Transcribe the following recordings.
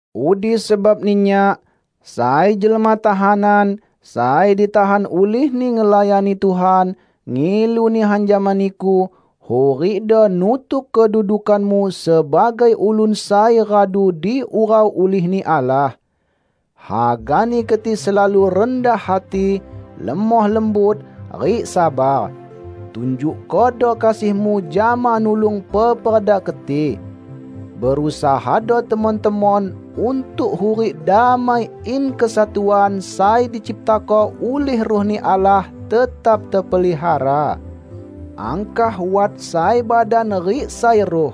Udi sebabni nyak -- sai jelma tahanan, sai ditahan ulihni ngelayani Tuhan -- ngilu nihan jama niku: hurikdo nutuk kedudukanmu sebagai ulun sai radu diurau ulih-Ni Allah. Hagani keti selalu rendah hati, lemoh lembut rik sabar. Tunjukkodo kasihmu jama nulung peperda keti. Berusahado temon-temon untuk hurik damai in kesatuan sai diciptako ulih Ruh-Ni Allah tetap tepelihara. Angkah wat sai badan rik sai Ruh.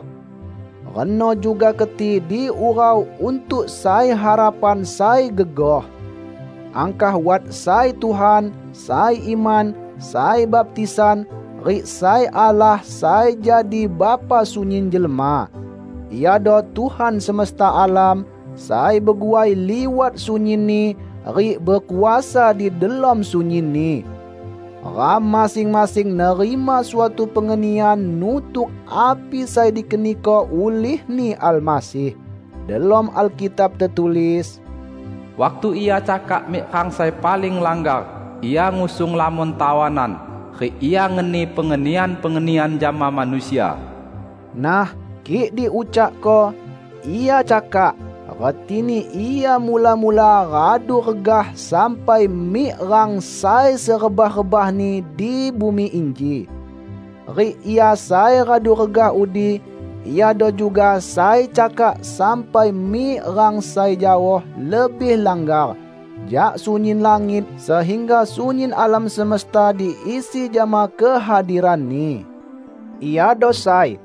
Reno juga keti diurau untuk sai harapan sai gegoh. Angkah wat sai Tuhan, sai iman, sai baptisan, rik sai Allah sai jadi Bapa sunyin jelma. Iado Tuhan semesta alam, sai beguai liwat sunyinni, rik bekuasa di delom sunyinni. Ram masing-masing nerima suatu pengenian nutuk api sai dikeniko ulih-Ni Almasih. Delom Alkitab tetulis, "Waktu Ia cakak mik rang sai paling langgar, Ia ngusung lamon tawanan; rik Ia ngeni pengenian-pengenian jama manusia." Nah, kik diucakko "Ia cakak" retini Ia mula-mula radu regah sampai mik rang sai serebah-rebahni di bumi inji. Rik Ia sai radu regah udi, Iado juga sai cakak sampai mik rang sai jaoh lebih langgar jak sunyin langit sehingga sunyin alam semesta diisi jama kehadiran-Ni. Iado sai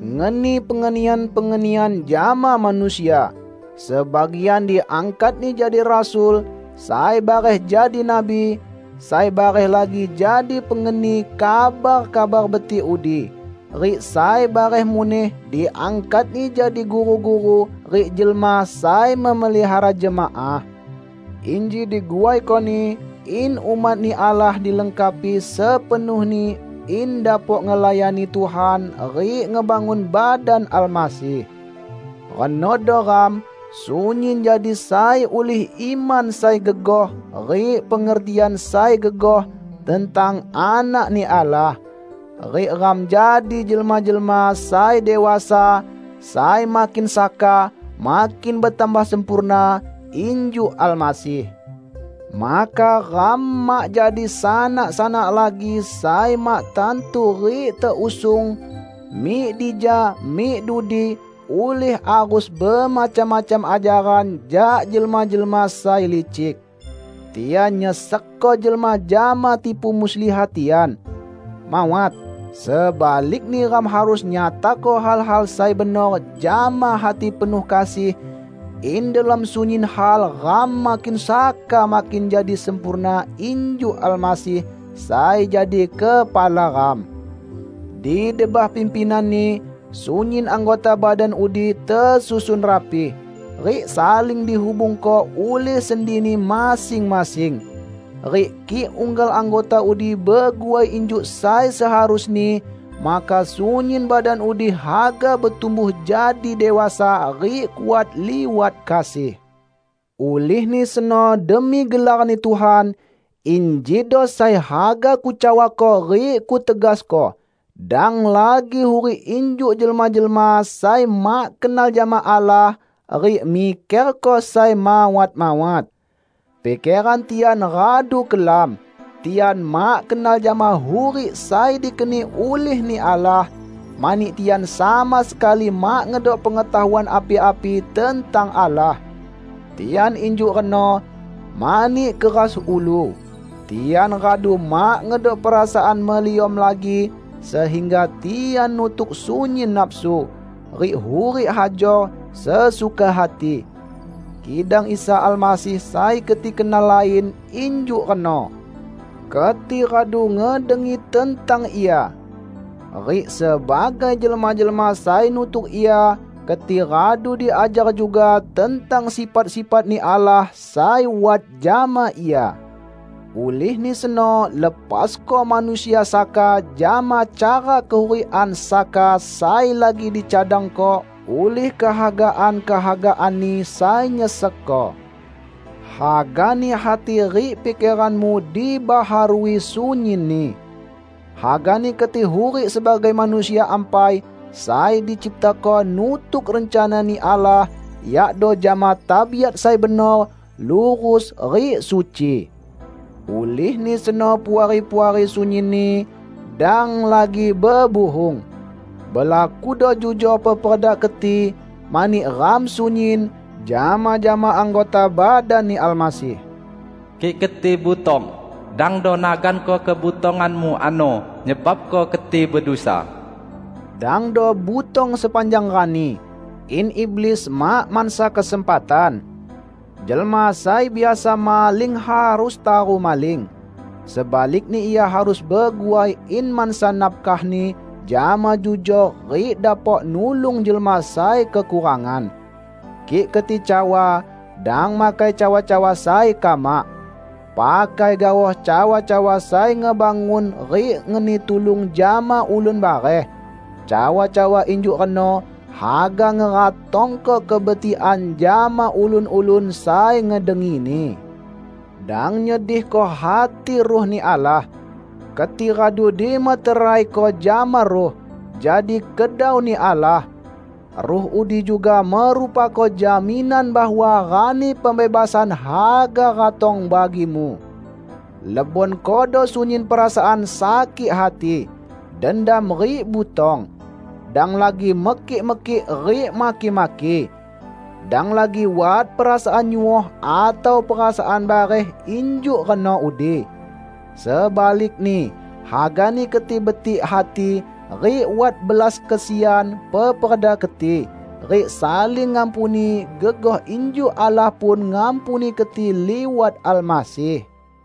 "ngeni pengenian-pengenian jama manusia", sebagian diangkat-Ni jadi rasul, sai bareh jadi nabi, sai bareh lagi jadi pengeni kabar Kabar Betik udi, rik sai bareh muneh diangkat-Ni jadi guru-guru rik jelma sai memelihara jemaah. Inji diguaiko-Ni in umat-Ni Allah dilengkapi sepenuhni in dapok ngelayani Tuhan rik ngebangun badan Almasih. Renodo ram sunyin jadi sai ulih iman sai gegoh rik pengertian sai gegoh tentang Anak-Ni Allah. Rik ram jadi jelma-jelma sai dewasa sai makin saka makin betambah sempurna injuk Almasih. Maka ram mak jadi sanak-sanak lagi sai mak tantu rik teusung mik dija mik dudi ulih arus bemacam-macam ajaran jak jelma-jelma sai licik. Tian nyesekko jelma jama tipu muslihat tian. Mawat! Sebalikni ram harus nyatako hal-hal sai benor jama hati penuh kasih, in delom sunyin hal ram makin saka makin jadi sempurna injuk Almasih, sai jadi kepala ram. Di debah pimpinan-Ni, sunyin anggota badan udi tesusun rapi, rik saling dihubungko ulih sendini masing-masing. Rik kik unggal anggota udi beguai injuk sai seharusni, maka sunyin badan udi haga betumbuh jadi dewasa rik kuat liwat kasih. Ulihni seno demi gelar-Ni Tuhan, injido sai haga kucawako rik kutegasko: dang lagi hurik injuk jelma-jelma sai mak kenal jama Allah, rik mikerko sai mawat-mawat. Pikeran tian radu kelam. Tian mak kenal jama hurik sai dikeni ulih-Ni Allah, mani tian sama sekali mak ngedok pengetahuan api-api tentang Allah. Tian injuk reno, mani keras ulu. Tian radu mak ngedok perasaan meliom lagi, sehingga tian nutuk sunyin nafsu, rik hurik hajor sesuka hati. Kidang Isa Almasih sai keti kenal lain injuk reno! Keti radu ngedengi tentang Ia! Rik sebagai jelma-jelma sai nutuk Ia, keti radu diajar juga tentang sifat-sifat-Ni Allah sai wat jama Ia. Ulihni seno lepasko manusia saka jama cara kehurikan saka sai lagi dicadangko ulih kehagaan-kehagaanni sai nyesekko. Hagani hati rik pikeranmu dibaharui sunyinni. Hagani keti hurik sebagai manusia ampai sai diciptako nutuk rencana-Ni Allah; yakdo jama tabiat sai benor, lurus rik suci. Ulihni seno Puari-puari sunyinni, dang lagi bebuhung. Belakudo jujor peperda keti, mani ram sunyin, jama-jama anggota badan-Ni Almasih. Kik keti butong, dangdo naganko kebutonganmu ano nyebabko keti bedusa. Dangdo butong sepanjang rani, in iblis mak mansa kesempatan. Jelma sai biasa maling harus taru maling. Sebalikni ia harus beguai in mansa nafkahni jama jujor rik dapok nulung jelma sai kekurangan. Kik keti cawa, dang makai cawa-cawa sai kamak. Pakai gaoh cawa-cawa sai ngebangun rik ngeni tulung jama ulun bareh. Cawa-cawa injuk reno haga ngeratongko kebetikan jama ulun-ulun sai ngedengini. Dang nyedihko hati Ruh-Ni Allah. Keti radu dimeteraiko jama Ruh, jadi kedau-Ni Allah. Ruh udi juga merupako jaminan bahwa Rani Pembebasan haga ratong bagimu. Lebonkodo sunyin perasaan sakik hati, dendam rik butong. Dang lagi mekik-mekik rik maki-maki. Dang lagi wat perasaan nyuoh atau perasaan bareh injuk reno udi. Sebalikni, hagani keti betik hati rik wat belas kesian peperda keti, rik saling ngampuni gegoh injuk Allah pun ngampuni keti liwat Almasih.